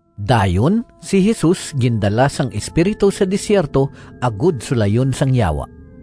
Dayon si Jesus gindala sang Espiritu sa desierto agod sulayon sang Yawa.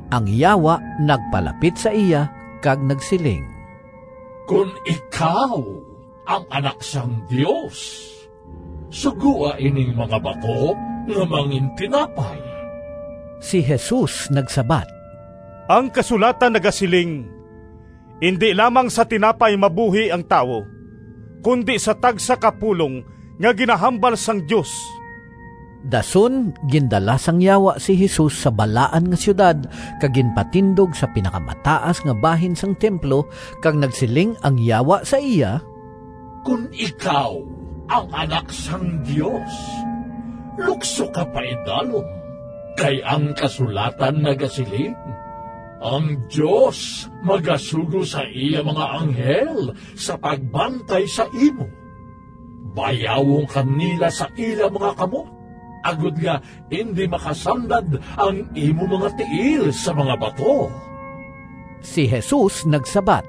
Ang Yawa nagpalapit sa iya kag nagsiling, “Kon ikaw ang Anak sang Dios, sugoa ining mga bato nga mangintinapay.” Si Jesus nagsabat, “Ang kasulatan nagasiling, ‘Indi lamang sa tinapay mabuhi ang tawo, kundi sa tagsa ka pulong nga ginahambal sang Dios.’” Dason gindala sang Yawa si Jesus sa Balaan nga Siyudad kag ginpatindog sa pinakamataas nga bahin sang templo, kag nagsiling ang Yawa sa iya, “Kon ikaw ang Anak sang Dios lukso ka paidalom, kay ang kasulatan nagasiling, ‘Ang Dios magasugo sa iya mga anghel Sa pagbantay sa imo; Bayawon ka nila sa ila mga kamot, Agod nga indi makasandad Ang imo mga tiil sa mga bato.’” Si Jesus nagsabat,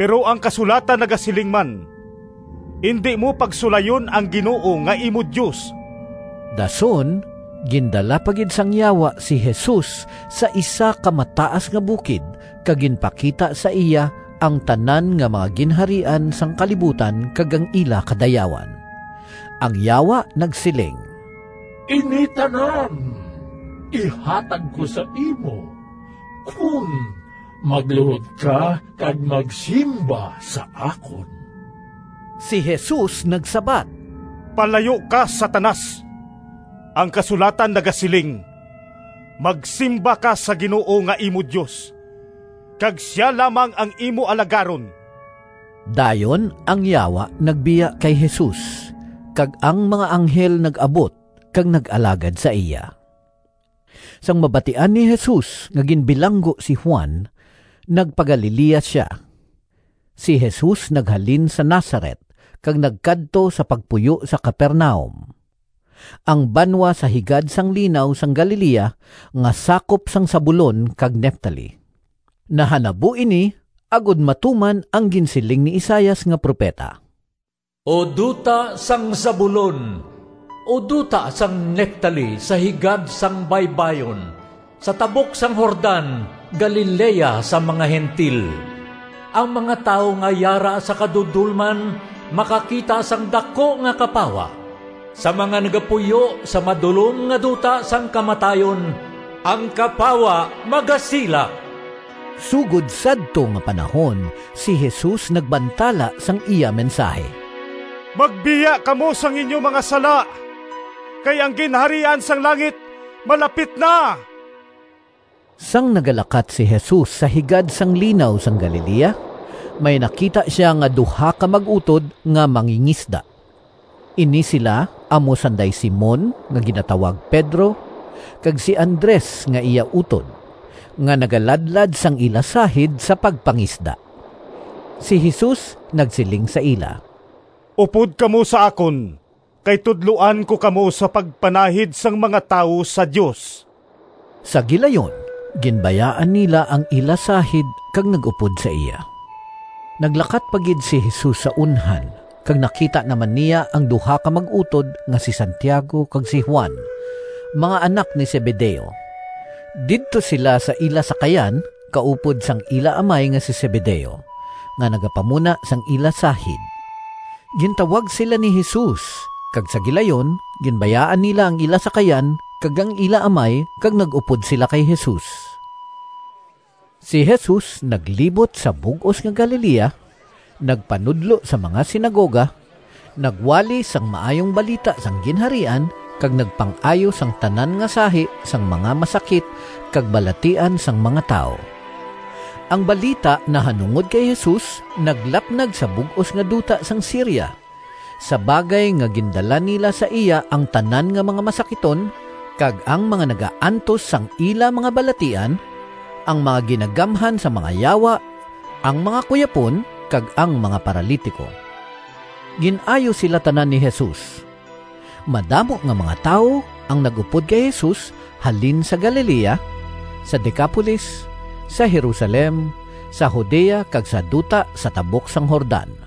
“Pero ang kasulatan nagasiling man, ‘Indi mo pagsulayon ang Ginoo nga imo Dios.’” Dason gindala pa gid sang Yawa si Jesus sa isa ka mataas nga bukid, kag ginpakita sa iya ang tanan nga mga ginharian sang kalibutan kag ang ila kadayawan. Ang Yawa nagsiling, “Ini tanan ihatag ko sa imo kon magluhod ka kag magsimba sa akon.” Si Jesus nagsabat, “Palayo ka, Satanas! Ang kasulatan nagasiling, ‘Magsimba ka sa Ginoo nga imo Dios, kag sia lamang ang imo alagaron!’” Dayon ang Yawa nagbiya kay Jesus, kag ang mga anghel nag-abot kag nag-alagad sa iya. Sang mabatian ni Jesus nga ginbilanggo si Juan, nagpa-Galilea sia. Si Jesus naghalin sa Nazaret kag nagkadto sa pagpuyo sa Capernaum, ang banwa sa higad sang Linaw sang Galilea nga sakop sang Zabulon kag Neftali. Nahanabo ini agod matuman ang ginsiling ni Isaias nga propeta: “O duta sang Zabulon, O duta sang Neftali, Sa higad sang baybayon, Sa tabok sang Jordan, Galilea sang mga Gentil! Ang mga tawo nga yara sa kadudolman Makakita sang daku nga kapawa! Sa mga nagapuyo Sa madulom nga duta sang kamatayon Ang kapawa magasilak!” Sugod sadto nga panahon si Jesus nagbantala sang iya mensahi, “Magbiya kamo sang inyo mga sala kay ang Ginharian sang langit malapit na!” Sang nagalakat si Jesus sa higad sang Linaw sang Galilea, may nakita sia nga duha ka mag-utod nga mangingisda. Ini sila amo sanday Simon nga ginatawag Pedro kag si Andres nga iya utod, nga nagaladlad sang ila sahid sa pagpangisda. Si Jesus nagsiling sa ila, “Upod kamo sa akon kay tudloan ko kamo sa pagpanahid sang mga tawo sa Dios.” Sa gilayon ginbayaan nila ang ila sahid kag nag-upod sa iya. Naglakat pa gid si Jesus sa unhan kag nakita naman niya ang duha ka mag-utod nga si Santiago kag si Juan, mga anak ni Zebedeo. Didto sila sa ila sakayan kaupod sang ila amay nga si Zebedeo nga nagapamuna sang ila sahid. Gintawag sila ni Jesus, kag sa gilayon ginbayaan nila ang ila sakayan kag ang ila amay kag nag-upod sila kay Jesus. Si Jesus naglibot sa bug-os nga Galilea; nagpanudlo sa mga sinagoga, nagwali sang Maayong Balita sang Ginharian, kag nagpang-ayo sang tanan nga sahi sang mga masakit kag balatian sang mga tawo. Ang balita nahanungod kay Jesus naglapnag sa bug-os nga duta sang Siria, sa bagay nga gindala nila sa iya ang tanan nga mga masakiton, kag ang mga nagaantos sang ila mga balatian: ang mga ginagamhan sang mga yawa, ang mga kuyapon kag ang mga paralitiko. Gin-ayo sila tanan ni Jesus. Madamo nga mga tawo ang nag-upod kay Jesus halin sa Galilea, sa Decapolis, sa Jerusalem, sa Judea kag sa duta sa tabok sang Jordan.